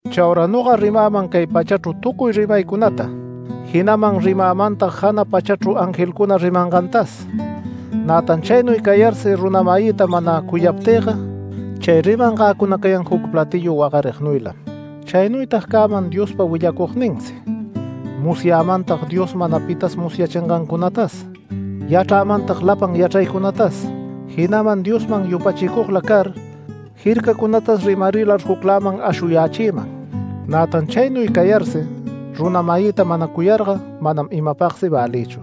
Chaura noga rimäman cay pachachru tucuy rimaycunata, jinaman rimämantag jana pachachru angelcuna rimangantas, nätan chaynuy cayarsi runa-mayïta mana cuyaptïga chay rimangäcuna cayan juc platillu wagarignuylam. Chaynuytag cäman Diospa willacugninsi, musyamantag Dios mana pita musyachingancunatas, yachrämantag lapan yachraycunatas, jinaman Diosman yupachicugla car jircacunatas rimarilar jucläman ashuyächïman, nätan chaynuy cayarsi runa-mayïta mana cuyarga manam imapagsi välïchu.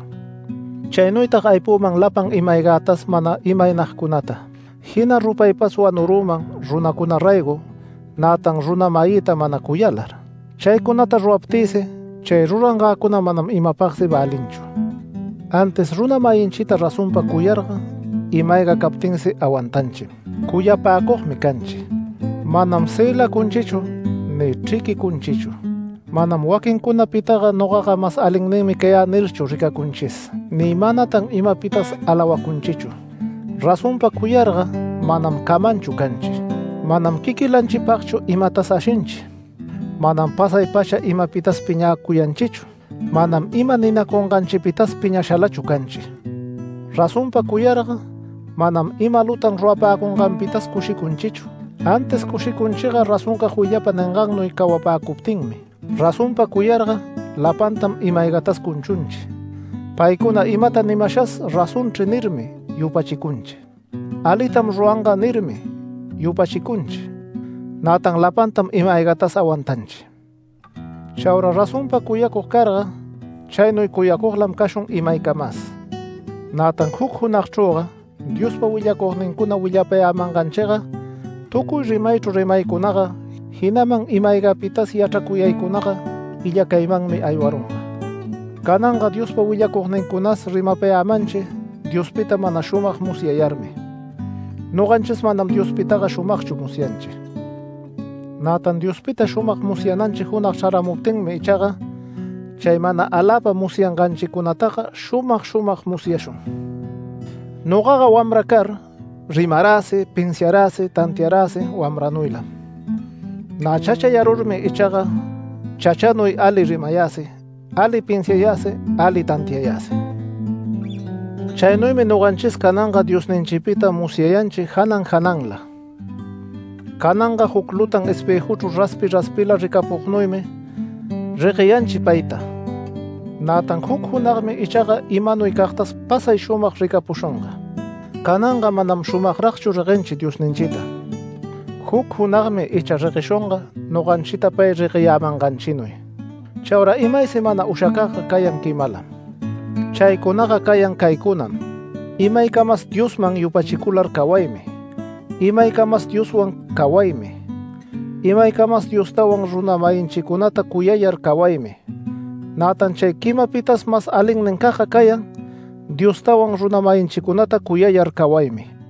Chaynuytag aypüman lapan ima-aygätas mana imaynagcunata, jina rupaypas wanurüman runacuna raygo, nätan runa-mayïta mana cuyalar, chaycunata ruraptïsi, chay rurangäcuna manam imapagsi välinchu. Antis runa-mayinchita razonpa cuyarga ima-ayga captinsi awantanchim, cuyapäcugmi canchi. Manam cëlacunchichu ni chriquicunchichu. Manam “Waquincunapitaga nogaga mas alinninmi cayä” nirchu ricacunchis, ni manatan imapitas alawacunchichu. Razonpa cuyarga manam camanchu canchi. Manam quiquilanchipagchu imatas ashinchi. Manam pasay-pacha imapitas piñäcuyanchichu. Manam ima ninacunganchipitas piñashalachu canchi. Razonpa cuyarga manam ima lutan rurapäcunganpitas cushicunchichu, antis cushicunchiga razoncag willapa ningannuy cawapäcuptinmi. Razonpa cuyarga lapantam ima-aygatas cunchunchi. Paycuna imata nimashas “Razonchri” nirmi yupachicunchi, “Alitam ruranga” nirmi yupachicunchi, nätan lapantam ima-aygatas awantanchi. Chaura razonpa cuyacug carga chaynuy cuyacuglam cashun imaycamas. Nätan juc junagchrüga Diospa willacugnincuna willapayämanganchiga, tucuy rimaychru rimaycunaga, jinaman ima-aygapitas yachracuyaycunaga illacaymanmi aywarunga. Cananga Diospa willacugnincunas rimapayämanchi Diospita mana shumag musyayarmi, noganchis manam Diospitaga shumagchu musyanchi. Nätan Diospita shumag musyananchi junag chraramuptinmi ichaga, chay mana aläpa musyanganchicunataga shumag shumag musyashun. Nogaga wamra car, rimaräsi, pinsiaräsi tantiaräsi wamranuylam. Nä chachayarurmi ichaga chachaynuy ali rimayäsi, ali pinsiayäsi ali tantiayäsi. Chaynuymi noganchis cananga Diosninchipita musyayanchi janan jananla. Cananga juc lutan espëjuchru raspi raspila ricapucugnuymi regueyanchi payta. Nätan juc junagmi ichaga imanuycagtas pasay shumag ricapushunga. Cananga manam shumagragchu reguenchi Diosninchita. Juc junagmi icha regueshunga noganchita pay regueyämanganchinuy. Chaura imaysi mana ushacagga cayan quimalam. Chaycunaga cayan caycunam: Imaycamas Diosman yupachicular cawaymi, imaycamas Dioswan cawaymi, imaycamas Diostawan runa-mayinchicunata cuyayar cawaymi. Nätan chay quimapitas mas alinnincagga cayan, Diostawan runa-mayinchicunata cuyayar cawaymi.